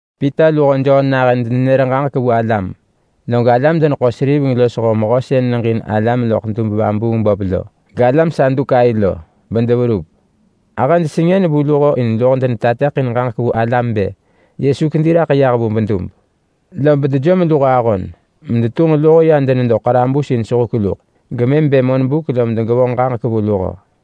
Pita luho Jon nahën denenër ġaġek vu alam, log alam-deneḳo-seriveng losho mehö sën neġin alam loḳ dub-vabuung-böp lo, galam Sadukai lo, bedeverup. Ahëj sengën vu luho in luho denenër ġaġek ranġah vu alam bë Yesu kedi raḳ yah vu bedub. Lob dejom luho ahon medetunġ luho ya denedo ḳarabus in sehuk luḳ, gemëm bë monbuk lom degevonġ ġaġek vu luho.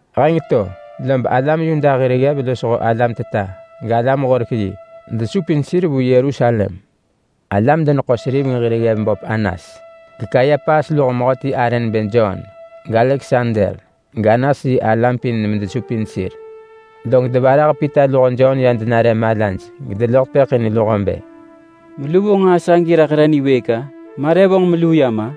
Heng to lob alam Yuda hir ggev losho alam teta, galam-horek-yi, desupin sir vu Yerusalem. Alam-deneḳo-seriveng hir ggev böp Anas, geKayapas luho mehöti arë nebë Jon, gAleksander, gAnas yi alam pin medesupin sir. Log devarah Pita luho Jon ya denare malaj gedeloḳ tepëḳ in luho bë, “Melu vonġ nġaa sagi raḳ re niwëëk-a? Ma re vonġ meluu yam-a?”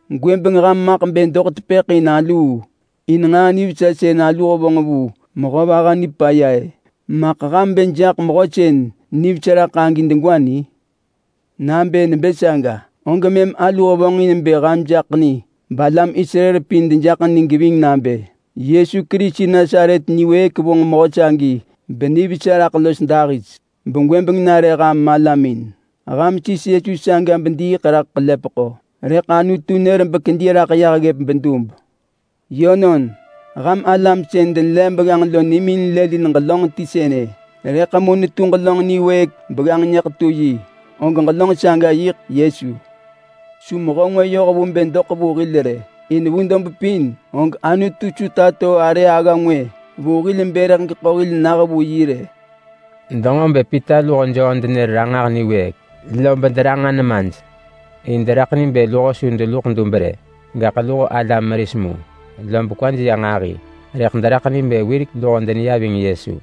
Gwëbeng ham maḳ bë doḳ tepëḳ in aluu in nġaa nivesa sën alu hevonġ vu mehö vaha nipaya-ë. Maḳ ham bë jaḳ mehö sën nivesa raḳ agi degwa ni? Nabë nebë saga, og mëm alu hevonġin bë ham jaḳ ni balam Israel pin dejaḳ ni geving nabë: Yesu Kerisi Nasaret niwëëk vonġ mehö sagi benivesa raḳ los dahis begwëbeng nare ham malamin. Ham sis mehö saga bediiḳ raḳ ḳelepeḳo, rëḳ Anutu nër bekedi raḳ yah ggëp bedub. Yönon! ‘Ham alam sën denelev begganġ lo nimin lëlin ġelönġ ti sënë. Rëḳ mu netu ġelönġ niwëëk begganġ nyëḳetu yi.’ Og ġelönġ saga yiḳ Yesu. Su mehö ngwë yoh vu bë doḳ vu hil rë. In vu dob pin og Anutu su tato arë agga ngwë vu hil bë rëḳ geḳo hil nah vu yi rë.” Denġo bë Pita luho Jon denër ranġah niwëëk, lob deranġa nemaj in deraḳ ni bë luho su deluḳ dub rë, gaḳ luho alam meris mu. Lob kwaj ya nġahi, rëḳ deraḳ ni bë wirek luho deneya ving Yesu.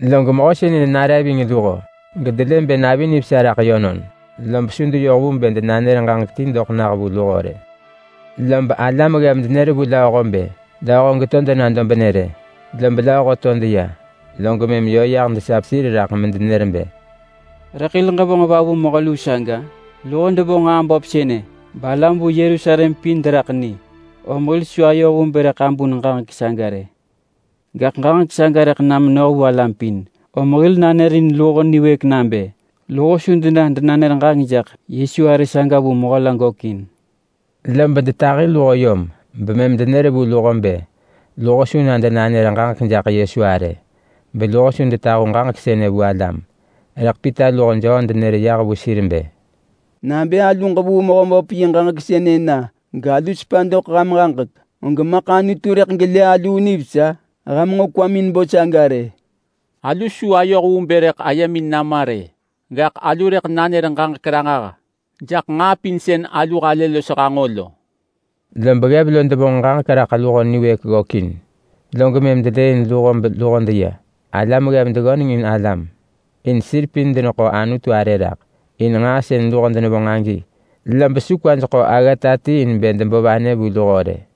Log mehö sënë nare ving luho gedelë bë navi nivesa raḳ yönon, lob su deyoh vu bë denanër ġaġek ti doḳ nah vu luho rë. Lob alam ggev denër vu lööho bë lööho degeto dena dobnë rë. Lob lööho to deya, log mëm yö yah desap sir raḳ medenër bë, “Rëḳ hil ġevonġ va vu mehö luu saga? Luho devonġ nġaa böp sënë balam vu Yerusalem pin deraḳ ni, om hil su ayoh vu bë rëḳ abun ġaġek saga rë. Gaḳ ġaġek saga rëḳ na menoh vu alam pin, om hil nanërin luho niwëëk nabë luho su dena denanër ġaġek jaḳ Yesu arë saga vu mehö la gökin.” Lob detahi luho yom bemëm denër vu luho bë luho su na denanër ġaġek jaḳ Yesu arë, beluho su detahu ġaġek sënë vu alam. Rëḳ Pita luho Jon denër yah vu sir bë, “Nabë alu ġevuu Mehöböp yi ġaġek sënë na galu sepa doḳ ham ġaġek, og maḳ Anutu rëḳ gelë aluu nivesa? Ham nġo kwamin bo saga rë. Alu su ayoh vu bë rëḳ ayemin nama rë. Gaḳ alu rëḳ nanër ġaġek ranġah jaḳ nġaa pin sën alu halë los hanġo lo!” Lob ggev lo devonġ ġaġek raḳ luho niwëëk ggökin, log mëm delëëin luho beluho deya. Alam ggev deggöneng in alam, in sir pin deneḳo Anutu arë raḳ in nġaa sën luho devonġ agi, lob su kwaj ḳo aggata ti in bë debo vanë vu luho rë.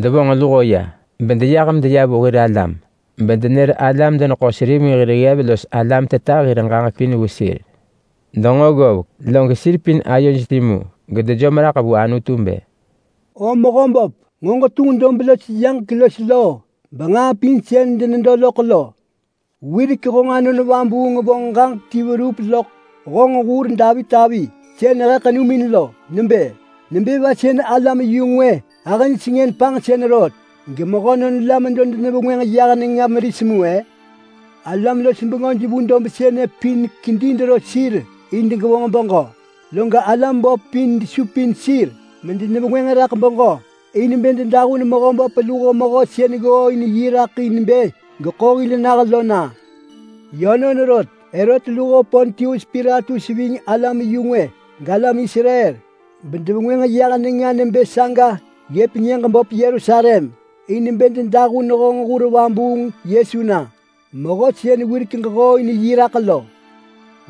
Devonġ luho ya, lob luho deyah medeya vu hir alam bedenër alam-deneḳo-seriveng hir ggev los alam teta hir ġaġek pin vu sir. Denġo ggovek, log sir pin ayoj timu gedejom raḳ vu Anutu bë, “O Mehöböp, nġo ġetunġ dob los yaġek los loo benġaa pin sën denedo loḳ lo. Wirek honġ Anon Vabuung vonġ ġaġek ti verup loḳ honġ hur Davit avi, sën he ḳenumin lo, nebë: ‘Nebë va sën alam-yu-ngwë ahëj sengën panġsën rot, gemehönon la medo denevengwënġ yah nenga meris mu-e? Alam-los-bengöj vu dob sënë pin kedi dero sir in degevonġ beġö, log alam böp pin desupin sir medevengwënġ raḳ beġö in bë dedahun Mehöböp luho Mehö sën ggooin raḳ in bë geḳo hil nah lo na.’ Yönon rot, Herot luho Pontius Pilatus ving alam-yu-ngwë, galam Israel, bedevengwënġ yah nenga nebë saga ggëp nyëġ böp Yerusalem in bë dedahun honġ hur vabuung Yesu na. Mehö sën wirek ġehooin yi raḳ lo.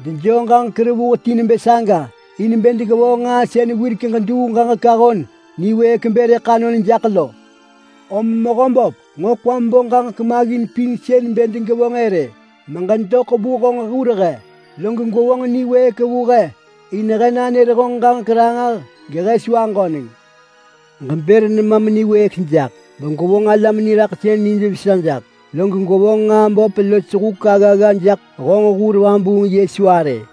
Dejoo ġaġek revuh ti nebë saga in bë degevonġ nġaa sën wirek ġeduu ġaġek ahon niwëëk bë rëḳ anon jaḳ lo. Om Mehöböp, nġo kwam bo ġaġek maggin pin sën bë degevonġ-ë rë meġedoḳ vu honġ hur he, log gwevonġ niwëëk vu he in he nanër honġ ġaġek ranġah, gehe su aġöneng. Ġebër nemam niwëëk jaḳ begwevonġ alam niraḳsën nijvesa jaḳ, log gwevonġ nġaa böp los huk aggagga jaḳ honġ hur vabuung Yesu arë.”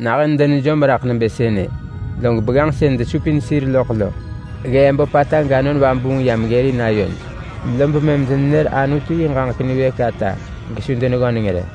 Nahën denejom raḳ nebë sënë, log begganġ sën desupin sir loḳ lo ggee böpata gAnon Vabuung yam ggërin ayoj, lob mëm denenër Anutu yi ġaġek niwëëk ata gesu deneggöneng rë.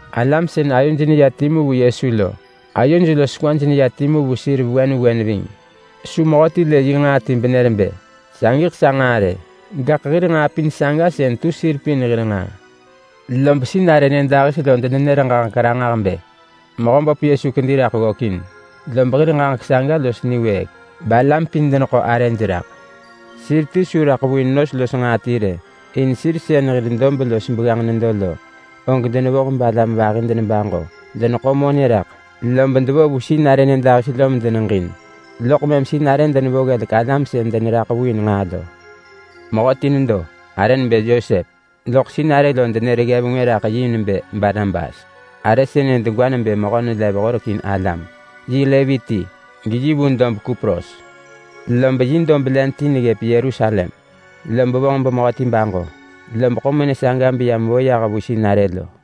Alam sën ayoj neya timu vu Yesu lo ahëj los ayoj neya timu vu sir vewen vewen ving. Su mehöti lë yi nġaa ti benër bë, “Sagiḳ sa nġaa!” rë, gaḳ hir nġaa pin saga sën tu sir pin hir nġaa. Lob sinarë nyëdahis lo denenër ġaġek ranġah bë Mehöböp Yesu kedi raḳ ggökin, lob hir ġaġek saga los niwëëk balam pin deneḳo arëj raḳ. Sir ti su raḳ vu in nos los nġaa ti rë, in sir sën deyoh vu dob los begganġ lo pin denevo vu alam vahi medeneḳo monë raḳ. Deneḳo monë raḳ, lob devo vu sinarë nyëdahis lo medeneġin, loḳ mëm sinarë denevo ggelek alam sën deneraḳ vu in nġaa lo. Mehöti nedo, arë nebë Yosep, lob sinarë denër ggev ngwë raḳ yi nebë Barnabas. Arë sënë degwa nebë mehö nelev horek in alam. Yi Levi ti, geyi vu dob Kupros. Lob yi dob len ti neggëp Yerusalem, lob vonġ bemehöti baġo, lob ḳo monë saga beya mevo vu sinarë lo.